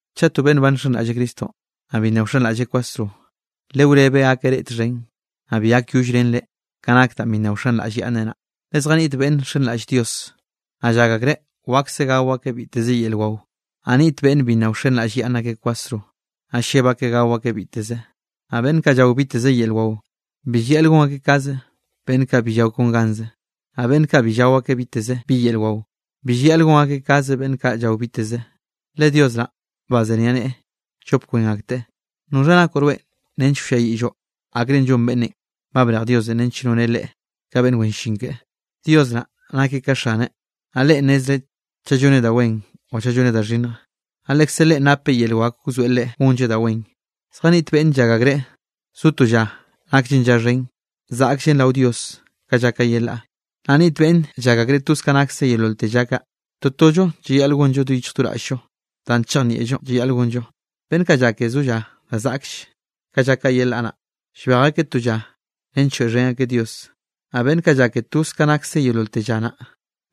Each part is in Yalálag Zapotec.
Chaꞌ to beꞌnn ba nxenraꞌlleꞌ Cristonꞌ, naꞌ bi nna wxenraꞌlleꞌ kwasro, lewrebeꞌ gakeꞌ reꞌ txhen, naꞌ bi gakyollrenreꞌ ka nak danꞌ bi nna wxenraꞌllyaꞌnneꞌ naꞌ. Le zjaniꞌt beꞌnn nxenraꞌll Dios, naꞌ llak akreꞌ wakse gao akeꞌ biteze yel wao, naꞌ niꞌt beꞌnn bi nna wxenraꞌllyaꞌnne kwasro, naꞌ lleb akeꞌ gao akeꞌ biteze. Naꞌ beꞌnn kaꞌ llao biteze yel wao, bi llayaꞌl gon akeꞌ kaze beꞌnn kaꞌ bi llao kon ganze, naꞌ beꞌnn kaꞌ bi llao akeꞌ biteze bi yel wao, bi llayaꞌl gon akeꞌ kaze beꞌnn kaꞌ llao biteze, le Dios naꞌ bazeniaꞌneꞌe llop kwen akteꞌ. ¿Noxha nakoꞌ rweꞌ nench wlliayiꞌlloꞌ akrenꞌ llon beꞌnnenꞌ ba brej Diosenꞌ nench noneꞌ leꞌe ka beꞌnn wen llin keꞌe? Dios naꞌ nakeꞌ ka xaneꞌ, naꞌ Leꞌen nnezreꞌ chaꞌ lloneꞌ da wen o chaꞌ lloneꞌ da xhinnj, naꞌ lekze Leꞌen napeꞌ yel wak wzoeꞌ leꞌe gonlleꞌ da wen. Zjaniꞌt beꞌnn llak akreꞌ zo to lla naklle lla xhen, zaꞌkllen rao Dios ka lla kaꞌ yelaꞌ. Naꞌ niꞌt beꞌnn llak akreꞌ toze ka nakse yeololte lla kaꞌ. Totollo llayaꞌl gonllon do yichj do raꞌll-llo danꞌ chejnieꞌllo llayaꞌl gonllo. Beꞌnn kaꞌ llake zo lla da zaꞌkll ka lla kaꞌ yelaꞌ naꞌ, llbej akeꞌ to lla nench lloeꞌxhen akeꞌ Dios. Naꞌ beꞌnn kaꞌ llake toze ka nakse yeololte lla naꞌ,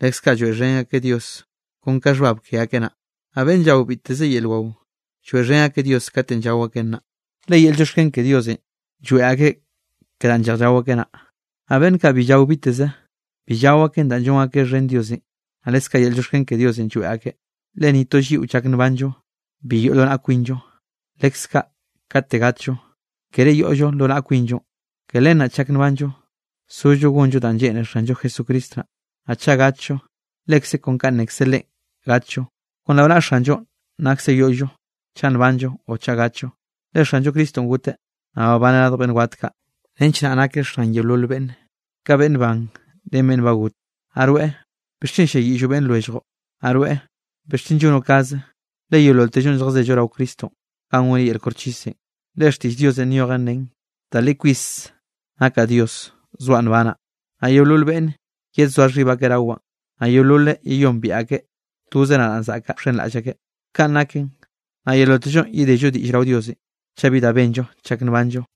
leskaꞌ lloeꞌxhen akeꞌ Dios, kon ka xhbab ke akeꞌ naꞌ. Naꞌ beꞌnn llao biteze yel wao, lloeꞌxhen akeꞌ Dios katenꞌ llao akeꞌn naꞌ, le yel llioxken ke Diosenꞌ lloeꞌ akeꞌ ke danꞌ lleꞌj llao akeꞌ naꞌ. Naꞌ beꞌnn kaꞌ bi llao biteze, bi llao akeꞌn danꞌ llon akeꞌ xhen Diosenꞌ, naꞌ leskaꞌ yel llioxken ke Diosenꞌ lloeꞌ akeꞌ. Le ni to lliꞌo chak nbanllo, bi yoꞌ lo naꞌllo kwinllo; leskaꞌ kate gatllo, kere yoꞌllo lo naꞌa kwinllo. Ke len naꞌ chak nbanllo, sollo gonllo danꞌ lleꞌne Xanllo Jesucristo naꞌ; naꞌ chaꞌ gatllo, lekze kon kanꞌ nnekze Leꞌen gatllo. Kon rao naꞌa Xanllo naksen yoꞌllo chaꞌ nbanllo o chaꞌ gatllo. Le Xanllo Cristonꞌ goteꞌ, naꞌ babaneꞌ radj beꞌnn wat kaꞌ nench naꞌ nakeꞌ Xan yeolol beꞌnn, ka beꞌnn ban ren beꞌnn ba got. Naꞌ rweꞌ, ¿bixchen ll-lliayiꞌlloꞌ beꞌnn lwelljoꞌn? ¿Naꞌ rweꞌ bixchen llonoeꞌ kaze? Le yeololtellonꞌ lljazello rao Cristonꞌ ganꞌ goneꞌ yel koxchisenꞌ. Le xtiꞌll Diosenꞌ nyojen nen: Da li kwis nakaꞌ Dios, zoaꞌ nbanaꞌ, naꞌ yeolol beꞌnne yedzoa xhib akeꞌ rawaꞌn, naꞌ yeololeꞌ yeyombiaꞌ akeꞌ toze nadaꞌn zaꞌkaꞌ wxenraꞌll akeꞌ. Kanꞌ naken, naꞌ yeololtellonꞌ yedello diꞌll rao Diosenꞌ, chaꞌ bi da benllo chak nbanllo.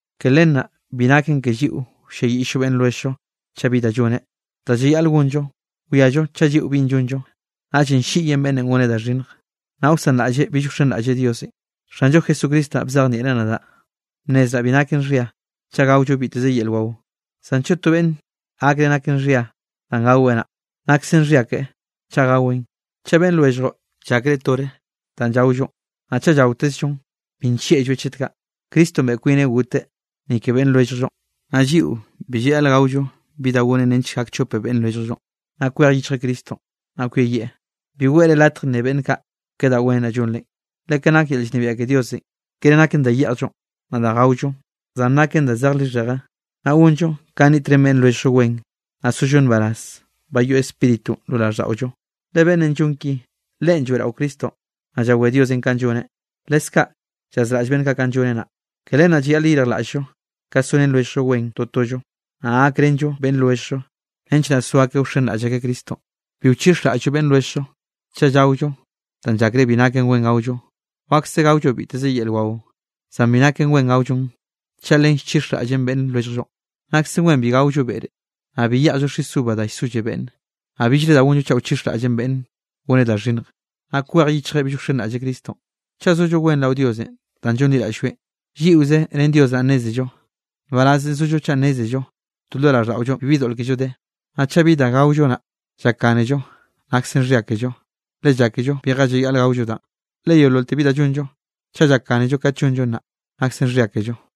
Ke len naꞌ bi naken ke lliꞌo wlliayiꞌll-llo beꞌnn lwelljllo chaꞌ bi da lloneꞌ. Da llayaꞌl gonllo, wiallo chaꞌ lliꞌon binꞌ llonllo, naꞌllenꞌ ll-lliꞌyen beꞌnnenꞌ goneꞌ da xhinnjenꞌ, naꞌ wsanraꞌlleꞌ bill wxenraꞌlleꞌ Diosenꞌ. Xanllo Jesucristo naꞌ bzejnieꞌreꞌ nadaꞌ bnnezraꞌ bi naken xhia chaꞌ gaollo biteze yel wao. Zan chaꞌ to beꞌnne gakreꞌ naken xhia danꞌ gaweꞌ naꞌ, naksen xhia keꞌe chaꞌ gaweꞌn. Chaꞌ beꞌnn lwelljllo llakreꞌ tore danꞌ llaollonꞌ, naꞌ chaꞌ llaotezllon, bi nllieꞌlloeꞌ chet kaꞌ. Cristonꞌ beꞌe kwineꞌ goteꞌ ni ke beꞌnn lwelljllonꞌ, naꞌ lliꞌo bi llayaꞌl gaollo bi da gonen nench gak chope beꞌnn lwelljllonꞌ, naꞌ kwej yichjeꞌ Cristonꞌ, naꞌ kweyieꞌ. Bi weꞌre latj nne beꞌnn kaꞌ ke da wen naꞌ llonre. Le ka nak yel llnebiaꞌ ke Diosenꞌ, kere naken da yeꞌjllon, naꞌ da gaollon. Zan naken da zej lixheje, naꞌ gonllo ka niꞌtrén beꞌnn lwelljllo wen, naꞌ sollo nbaraz ba yoꞌ Spíritunꞌ lo raꞌlldaꞌollo. Le beꞌnnenꞌ llon ki, leꞌen lloeꞌraweꞌ Cristonꞌ. Naꞌ llawé Diosenꞌ kanꞌ lloneꞌ, leskaꞌ llazraꞌll beꞌnn kaꞌ kanꞌ lloneꞌ naꞌ. Ke len naꞌ llayaꞌl yeyirjlaꞌll-llo ka sorén lwelljllo wen totollo, naꞌ gakrenllo beꞌnn lwelljllo, nench naꞌ so akeꞌ wxenraꞌll akeꞌ Cristonꞌ. Bi wchixraꞌll-llo beꞌnn lwelljllo chaꞌ llaollo da llakreꞌ bi naken wen gaollo. Wakse gaollo biteze yel wao, zan bi naken wen gaollon chaꞌ len llchixraꞌllen beꞌnn lwelljllo. Naksen wen bi gaollo beꞌre, naꞌ bi yeꞌjllo xis uva da llsolle beꞌnne, naꞌ billre da gonllo chaꞌ wchixraꞌllen beꞌnne goneꞌ da xhinnje, naꞌ kwej yichjeꞌ bill wxenraꞌlleꞌ Cristonꞌ. Chaꞌ zollo wen rao Diosenꞌ danꞌ llonliraꞌll-lloeꞌ, lliꞌoze ren Dios naꞌ nnézello. Nbarazenꞌ zollo chaꞌ nnézello to lo raꞌlldaꞌollonꞌ bibi doꞌl kello de. Naꞌ chaꞌ bi da gaollo naꞌ llakgánello, nakse xhia kello, le llákello bije llayaꞌl gaollo danꞌ. Le yeololte bi da llonllo, chaꞌ llakgánello kat llonllon naꞌ, naksen xhyia kello.